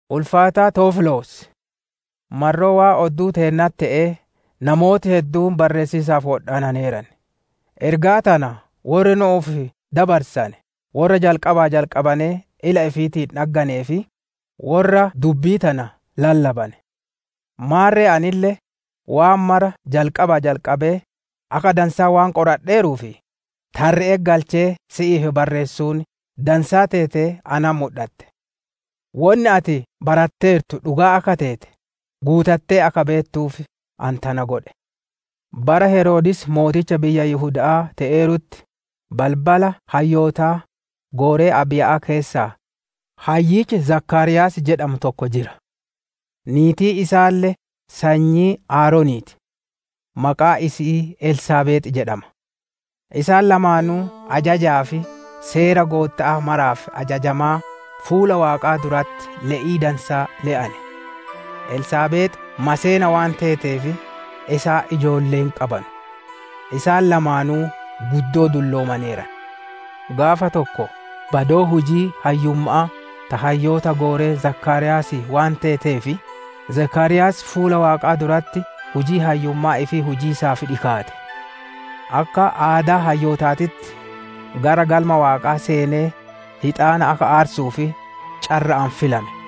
Ulfaataa Tewoofiloos! Marroo waan odduu teennatti te'ee namooti hedduun barreessiisaaf wodhaananeeran. Ergaa tana worri nu'uuf dabarsane worra jalqabaa jalqabanee ila ifiitiin dhagganee fi worra dubbii tana lallabane. Maarre anille, waan mara jalqabaa jalqabee, akka dansaa waan qoradheeruuf, tarre'etti galchee si'iif barreessuun dansaa teetee natti mudhatte. Wonni ati baratteertu dhugaa akka teete guutattee akka beettuuf, ani tana godhe. Bara Heroodis mooticha biyya Yihuda'aa te'eerutti, balbala hayyootaa, gooree Abiiya'aa keessaa hayyichi Zakaariyaas jedhamu tokko jira. Niitiin isaalle sanyii Aaronii ti; maqaan isi'ii Elsaabeex jedhama. Isaan lamaanuu ajajaa fi seera Gootta'aa maraaf ajajamaa fuula Waaqaa duratti le'ii dansaa le'ane. Elsaabeex maseena waan teeteef, isaan ijoollee hin qabanu. Isaan lamaanuu guddoo dulloomaneeran. Gaafa tokko, badoon hujii hayyumma'aa ta hayyoota gooree Zakaariyaasii waan teeteef, Zakaariyaas fuula Waaqaa duratti hujii hayyummaa ifii hujiisaaf dhikaate. Akka aadaa hayyootaatitti, gara Galma Waaqaa seenee hixaana akka aarsuuf carra'aan filame.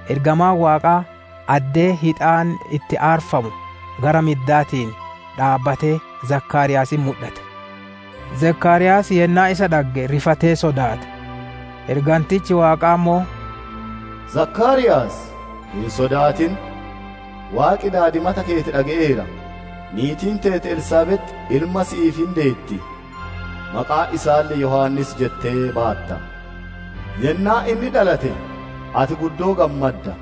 Ergamaan Waaqaa addee hixaanni itti aarfamu gara middaatiin dhaabbatee Zakaariyaasitti mudhate. Zakaariyaas yennaa isa dhagge rifatee sodaate. Ergantichi Waaqaa ammoo, «Zakaariyaas hin sodaatin! Waaqi daadimata keeti dhage'eera; niitiin teeti Elsaabeex ilma si'iif hin deetti; maqaa isaalle Yohaannis jettee baatta. Yennaa inni dhalate ati guddoo hin gammadda;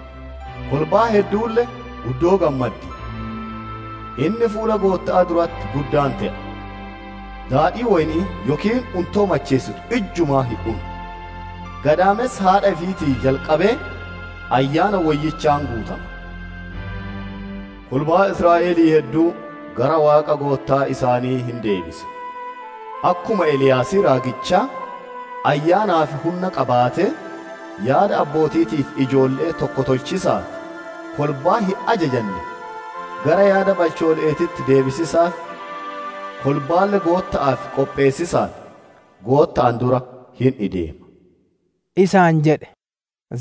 kolbaan hedduulle guddoo gammaddi. Inni fuula Gootta'aa duratti guddaa hin te'a; daadhii woyni'ii yookiin untoo macheessitu ijjumaa hin unu; gadaamessa haadha ifiitii jalqabee Ayyaana Woyyichaan hin guutama. Kolbaa Israa'elii hedduu gara Waaqa Goottaa isaanii hin deebisa. Akkuma Eliyaasii raagichaa Ayyaanaa fi hunna qabaatee, yaada abbooti'iitii fi ijoolle'ee tokko tolchiisaaf, kolbaa hin ajajanne gara yaada balchoole'eetitti deebisiisaaf, kolbaalle Gootta'aaf qopheessiisaaf Gootta'aan dura hin ideema» isaan jedhe.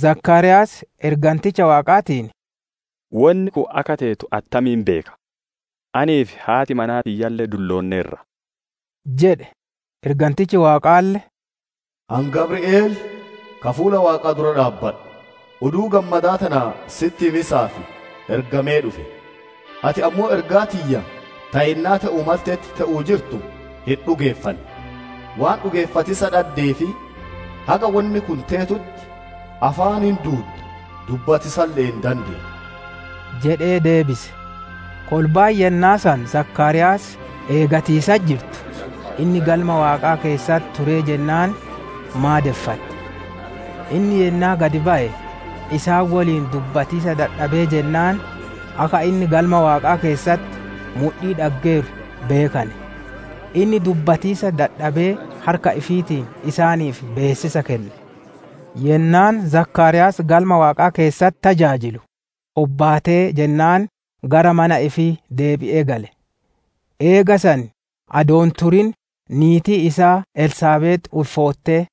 Zakaariyaas Erganticha Waaqaatiin, «Wonni kun akka teetu attamiin beeka? Anii fi haati manaa tiyyalle dulloonneerra» jedhe. Ergantichi Waaqaalle, «Ani Gabri'eel, ka fuula Waaqaa dura dhaabbadhu, oduu gammadaa tana sitti himiisaaf ergamee dhufe. Ati ammoo ergaa tiyya ta yennaa te'uu maltetti, te'uu jirtu hin dhugeeffanne. Waan dhugeeffatiisa dhaddeef haga wonni kun teetutti, afaan hin duudda; dubbatiisalle hin dandeettu» jedhee deebise. Kolbaan yennaa san Zakaariyaas eegatiisatti jirtu, inni Galma Waaqaa keessatti turee jennaan maadeffatte. Inni yennaa gad baye, isaan woliin dubbatiisa dadhabee jennaan, akka inni Galma Waaqaa keessatti mudhii dhaggeeru beekane. Inni dubbatiisa dadhabee harka ifiitiin isaaniif beessisa kenne. Yennaan Zakaariyaas Galma Waaqaa keessatti tajaajilu hobbaatee jennaan gara mana ifii deebi'ee gale. Eega san adoo hin turin niitiin isaa Elsaabeex ulfoottee,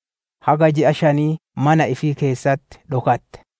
haga ji'a shanii mana ifii keessatti dhokatte.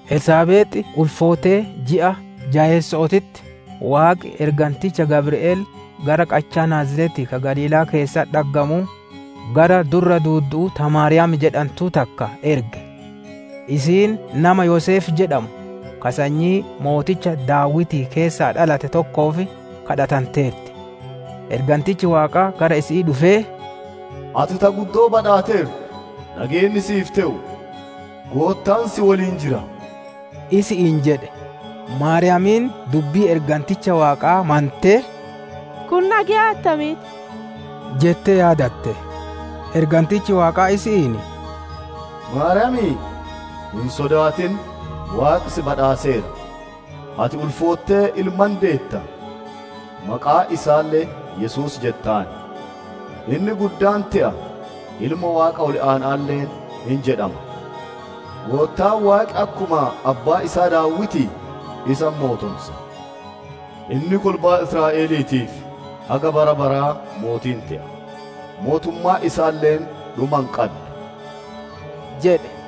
Elsaabeex ulfoottee ji'a jayeesso'ootitti Waaqi erganticha Gabri'eel gara qachaa Naaziretii ka Galiilaa keessatti dhaggamuu, gara durra duuddu'uu ta Maariyaam jedhantuu takka erge. Isiin nama Yoseef jedhamu ka sanyii Mooticha Daawitii keessaa dhalate tokkoof kadhatanteerti. Ergantichi Waaqaa gara isi'ii dhufee, «Ati ta guddoo badhaateertu; nageenni si'iif te'u; Goottaan si woliin jira!» isi'iin jedhe. Maariyaamiin dubbii erganticha Waaqaa mantee «Kun nageya attamiiti?» jettee yaadatte. Ergantichi Waaqaa isi'iin, «Maariyaam, hin sodaatin! Waaqi si badhaaseera. Ati ulfoottee ilma hin deetta; maqaa isaalle Yesuus jettaan. Inni guddaa hin te'a, Ilma Waaqa Ol Aana'aalle hin jedhama. Goottaan Waaqi akkuma abbaa isaa Daawitii isa hin mootonsa. Inni kolbaa Israa'eliitiif haga bara baraa mootii hin te'a, mootummaan isaalle dhuma hin qaddu» jedhe.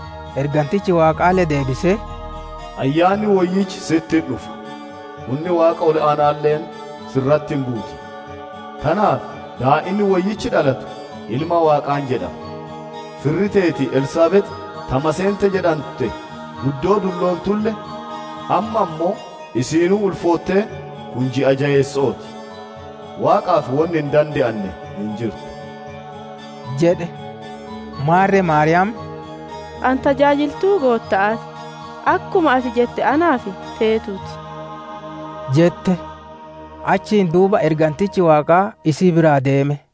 Ergantichi Waaqaalle deebisee, «Ayyaanni Woyyichi si'itti hin dhufa, hunni Waaqa Ol Aana'aalle si irratti hin buuti. Tanaaf daa'inni woyyichi dhalatu Ilma Waaqaa hin jedhama. Firri teeti Elsaabeex ta maseente jedhante, guddoo dulloontulle, amma ammoo isiinuu ulfoottee kun ji'a jayeesso'oo ti. Waaqaaf wonni hin dande'anne hin jirtu» jedhe. Maarre Maariyaam, «Ani tajaajiltuu Gootta'aa ti. Akkuma ati jette naaf teetuutii!» jette. Achiin duuba ergantichi Waaqaa isii biraa deeme.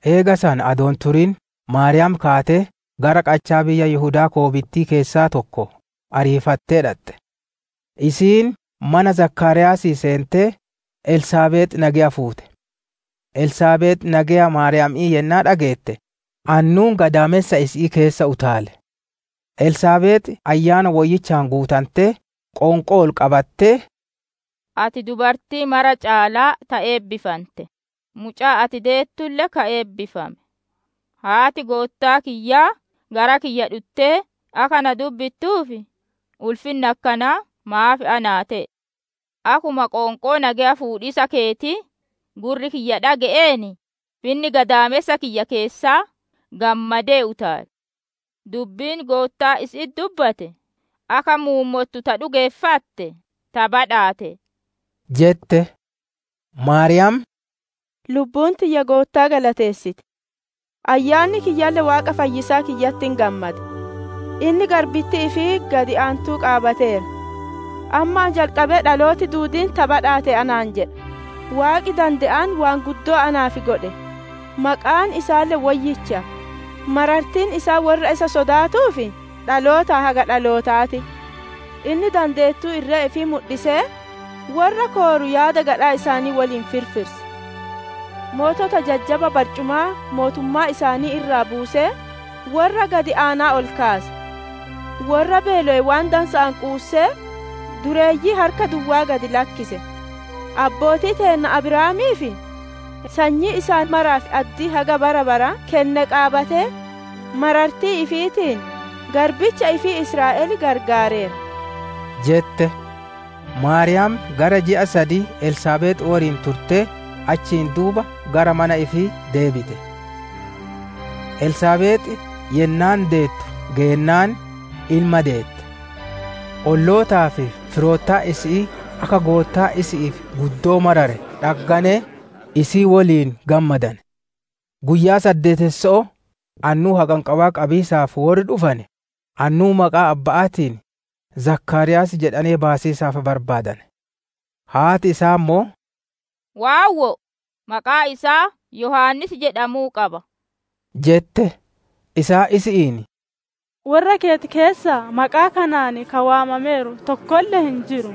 Eega san adoo hin turin Maariyaam kaatee, gara qachaa biyya Yihudaa koobitti'ii keessaa tokko ariifattee dhaxxe. Isiin mana Zakaariyaasii seentee, Elsaabeex nageya fuute. Elsaabeex nageya Maariyaami'ii yennaa dhageette, annuun gadaamessa isi'ii keessa utaale. Elsaabeex Ayyaana Woyyichaan guutantee, qoonqoo ol qabattee, «Ati dubartii mara caalaa ta eebbifante, mucaan ati deettulle ka eebbifame! Haati Goottaa kiyyaa gara kiyya dhuttee, akka na dubbittuuf ulfinni akkanaa maaf naa te'e? Akkuma qoonqoo nageya fuudhiisa keetii gurri kiyya dhage'een, finni gadaamessa kiyya keessaa gammadee utaale. Dubbiin Goottaan isi'itti dubbate akka muummottu ta dhugeeffatte ta badhaate» jette. Maariyaam: «Lubbuun tiyya Goottaa galateessiti; ayyaanni kiyyalle Waaqa fayyisaa kiyyatti hin gammada. Inni garbittii ifii gad aantuu qaabateera. Ammaa jalqabee dhalooti duudiin ta badhaate anaan jedha. Waaqi dande'aan waan guddoo naaf godhe. Maqaan isaalle woyyicha. Marartiin isaa worra isa sodaatuuf dhalootaa haga dhalootaa ti. Inni dandeettuu irree ifii mudhisee, worra kooru yaada gadhaa isaanii woliin firfirse. Mootota jajjaba barcumaa mootummaa isaanii irraa buusee, worra gad aanaa ol kaase. Worra beelowe waan dansa'aan quussee, dureeyyii harka duwwaa gad lakkise. Abbootii teenna Abrahaamii fi sanyii isaa maraaf addii haga bara baraa kenne qaabatee, marartii ifiitiin garbicha ifii Israa'el gargaareera» jette. Maariyaam gara ji'a sadii Elsaabeex woliin turtee, achiin duuba gara mana ifii deebite. Elsaabeex yennaan deettu geennaan, ilma deette. Ollootaa fi firoottan isi'ii akka Goottaan isi'iif guddoo marare dhagganee, isii woliin gammadane. Guyyaa saddeetesso'oo annuu haqanqabaa qabiisaaf worri dhufane, annuu maqaa abba'aatiin, Zakaariyaas jedhanee baasiisaaf barbaadane. Haati isaa ammoo, «Waawwoo! Maqaan isaa Yohaannis jedhamuu qaba» jette. Isaan isi'iin, «Worra keeti keessaa maqaa kanaan ka waamameeru tokkolle hin jiru»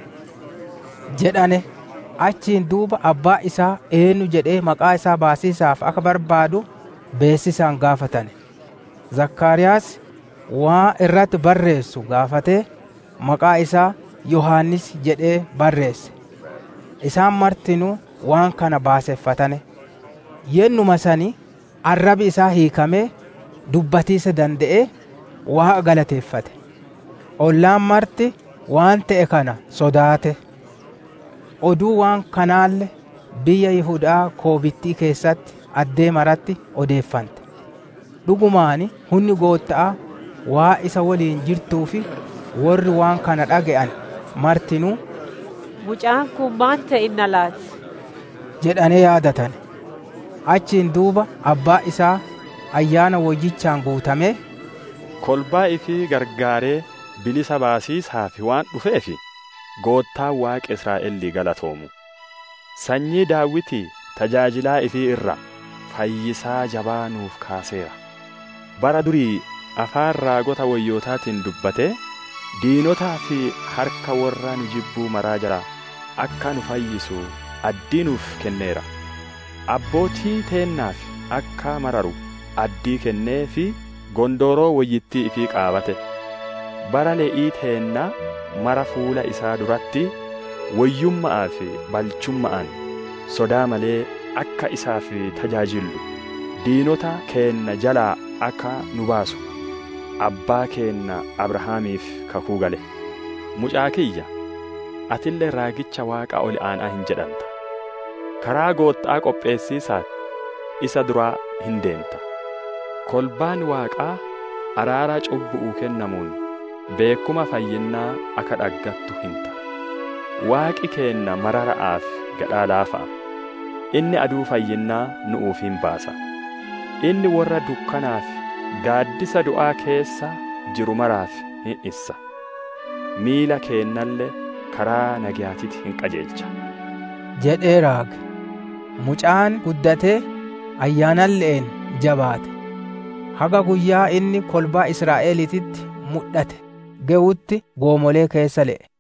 jedhane. Achiin duuba abbaan isaa eennu jedhee maqaa isaa baasiisaaf akka barbaadu beessisaan gaafatane. Zakaariyaas waan irratti barreessu gaafatee, «Maqaan isaa Yohaannis» jedhee barreesse. Isaan martinuu waan kana baaseffatane. Yennuma san arrabi isaa hiikamee, dubbatiisa dande'ee, Waaqa galateeffate. Ollaan marti waan te'e kana sodaate. Oduun waan kanaalle biyya Yihuda'aa goorittii keessatti addee maratti odeeffante. Dhugumaan hunni Gootta'aa waan isa woliin jirtuuf, worri waan kana dhage'ane martinuu, «Mucaan kun maan te'inna laati?» jedhanee yaadatane. Achiin duuba abbaan isaa Ayyaana Woyyichaan guutamee, «Kolbaa ifii gargaaree, bilisa baasiisaaf waan dhufeef, Goottaan Waaqi Israa'elii galatoomuu! Sanyii Daawitii tajaajilaa ifii irraa, fayyisaa jabaa nu'uuf kaaseera. Bara durii, afaan raagota woyyootaatiin dubbatee, diinotaa fi harka worra nu jibbuu mara jalaa akka nu fayyisu addii nuuf kenneera. Abbootii teennaaf akka mararu addii kennee fi gondooroo woyyittii ifii qaabate. Bara le'ii teennaa mara fuula isaa duratti woyyumma'aa fi balchumma'aan, sodaa malee akka isaaf tajaajillu, diinota keenna jalaa akka nu baasu, abbaa keenna Abrahaamiif kakuu gale. Mucaa kiyya, atille, raagicha Waaqa Ol Aana'aa hin jedhanta, karaa Gootta'aa qopheessiisaaf isa dura hin ideenta. Kolbaan Waaqaa araara cubbu'uu kennamuun, beekkuma fayyinnaa akka dhaggattu hinta. Waaqi keenna marara'aa fi gadhaa laafa'a. Inni aduu fayyinnaa nu'uuf hin baasa. Inni worra dukkanaa fi gaaddisa du'aa keessa jiru maraaf hin issa; miila keennalle karaa nageyaatitti hin qajeelcha» jedhee raage. Mucaan guddatee, Ayyaanalle'een jabaate; haga guyyaan inni kolbaa Israa'eliititti mudhate gewutti goomolee keessa le'e.